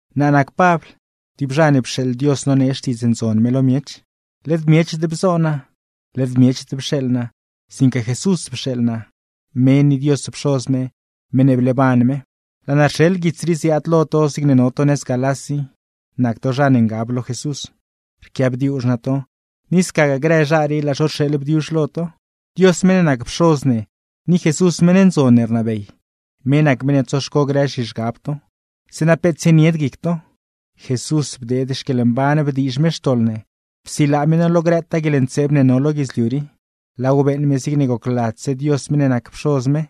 Naa nac Pabl, tib zha ne pxeeḻ Dios nonee Xtiidz Ndzon me lo miech. Led miechd bzoo naa, led miechd pxeeḻ naa, sinque Jesús pxeeḻ naa, me ni Dios Pxoz me, meṉ ne bleeban me. Laa naa rxeḻ tib guits rii ziaad lo to zigne no to nëz Galás i, nac to zha ne ngab lo Jesús; rquiaabdiuzh naa to, ni scagaa grë zha rii laa zho rxeeḻ bdiuzh lo to. Dios meṉ ne nac Pxoz ne, ni Jesús meṉ ndzon ne rnabey, me nac meṉ ne tsoxco grë zhizhgab to, zeeṉa peet tsienied guic to. Jesús bdeed xquieḻmban bdiizh me xtoḻ ne, psilaa me no lo grëtaa guieḻntseeb ne no lo guidzliu rii, laaw beeṉ me zigne gocladzse Dios meṉ ne nac Pxoz me.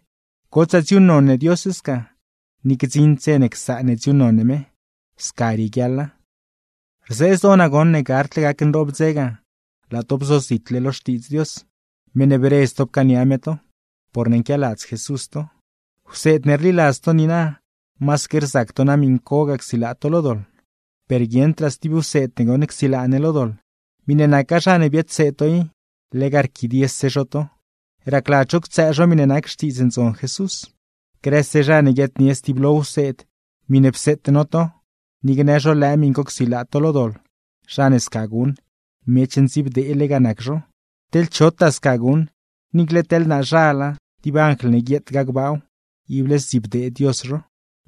¡Gotsaa dziuuṉnon ne Dios sca, ni gdziṉd dze ne csaan ne dziuuṉnon ne me! Sca rieguiaḻa. Rzee zdoo naa goṉ ne gardle gac nroob dze ga, laa to bzozitle lo Xtiidz Ndzon Dios, meṉ ne bredz to pcaania me to, porne nquialadz Jesús to. Wseed ne rliladz to niina, masaque rzac to na miṉcogaa csilaa to lo doḻ. Per guieṉdraa stib wseed ne goṉ csilaa ne lo doḻ. Miṉe naca zha ne biadseed to i, lega rquidiese zho to, racladz zho ctsëë zho miṉe nac Xtiidz Ndzon Jesús. Grëse zha ne guiaadnie stiblo wseed miṉe pseete no to, ni gnë zho lëë miṉ co csilaa to lo doḻ; zha ne sca guṉ, miech ndziibdeele ga nac zho. Teḻ chotaa sca guṉ, niicle teḻ naazhala, tib anjl ne guietgaa gbaaw, ible zdzibdee Dios zho.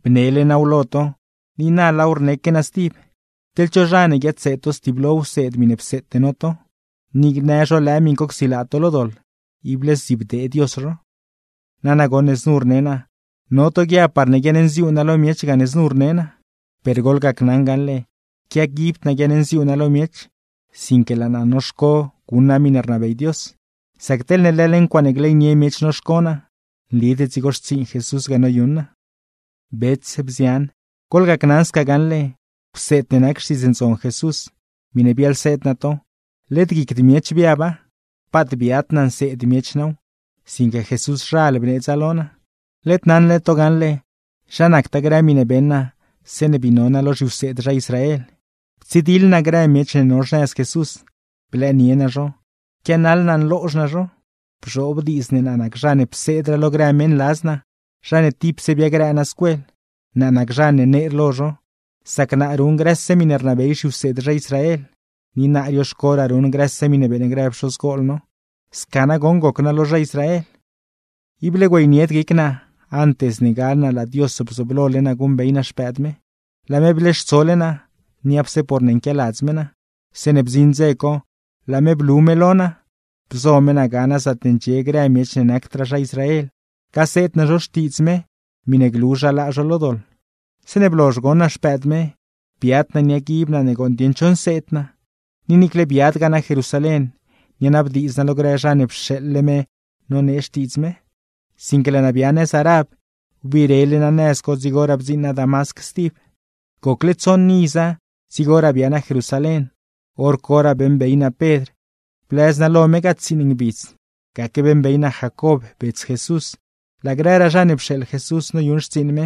Bnele naaw lo to, ni na laaw rneque naa stib: Teḻ cho zha ne guiadseed to stiblo wseed miṉe pseete no to, ni gnë zho lëë miṉ co csilaa to lo doḻ, ible zdzibdee Dios zho. Nana goṉ ne znu rne naa, no to guiab parne guiaṉnziuu naa lo miech gane znu rne naa; per goḻgacnaṉ gaṉle, quiaguibd naa guiaṉnziuu naa lo miech, sinque laa naa noxco guṉ naa miṉe rnabey Dios. ¡Sac teḻne leḻ ncuaaṉe gleynie miech noxco naa, nlid dzigo xtsiiṉ Jesús ga noyuṉ naa! Bets, bzian, goḻgacnaṉ sca gaṉle: Wseed ne nac Xtiidz Ndzon Jesús, miṉe biaḻseed naa to, led guicd miech biaba. Paat biad naa nseed miech naaw, sinque Jesúszhal bneedza lo naa. Led naṉle to gaṉle, zha nactaa grë miṉe beṉ naa zeeṉe bii no naa lo zhiwseed zha Israel; ptsidiḻ naa grë miech ne no xnëz Jesús, blëënie naa zho, pquianaḻ naa nloozh naa zho. Bzhoob diidz ne naa nac zha ne pseedraa lo grë meṉladz naa, zha ne tipse biagrëë naa scuel; naa nac zha ne neer lo zho, sac naa ruṉ grëse miṉe rnabey zhiwseed zha Israel, ni naa rioxcoraa ruṉ grëse miṉe beeṉ grë pxozgol no. Sca nagoṉ goc naa lo zha Israel. Ible güeynied guic naa, antes ne gal naa laa Dios bzooblole naa guṉbey naa Xpëëd me; laa me bleextsole naa, niapse porne nquialadz me naa. Zeeṉe bdziṉ dze co laa me blu me lo naa, bzo me naa ga naa zaatne ndxie grë miech ne nacdraa zha Israel, gaseed naa zho Xtiidz me miṉe glu zha laa zho lo doḻ. Zeeṉe blozh goṉ naa Xpëëd me, biad naa niaguib naa ne gooṉ dieṉ cho nseed naa, ni niicle biadgaa naa Jerusalén, nianabdiidz naa lo grë zha ne pxeeḻle me nonee Xtiidz me; sinque laa naa bia nëz Arab, wbirele naa nëz co, dzigoraa bdziiṉ naa Damasc stib. Gocle tsoṉ iza dzigoraa bia naa Jerusalén, hor coraa beeṉbey naa Pedr; blëz naa lo me ga tsiiṉ ngbidz. Gaque beeṉbey naa Jacob bets Jesús, laa grëraa zha ne pxeeḻ Jesús noyuṉ xtsiiṉ me,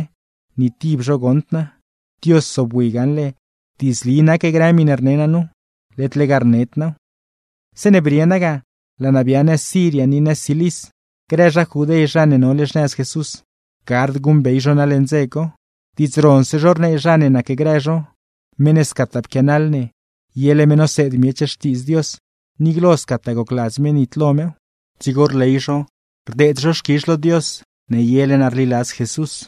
ni tib zho goṉd naa. Dios zobwi gaṉle diidzli nac grë miṉe rne naa nu, led lega rned naaw. Zeeṉe brie naa ga, laa naa bia nëz Siria ni nëz Cilis. Grë zha Judé zha ne nole xnëz Jesús, gard guṉbey zho naa leṉ dze co. Diidz ronse zho rnee zla zha ne nacgrë zho: “Meṉ ne scataa pquianaḻ ne, yele me noseed miech Xtiidz Dios, ni glo scataa gocladz me nitlo mew.” Dzigo rley zho, rdeed zho xquizh lo Dios ne yele naa rliladz Jesús.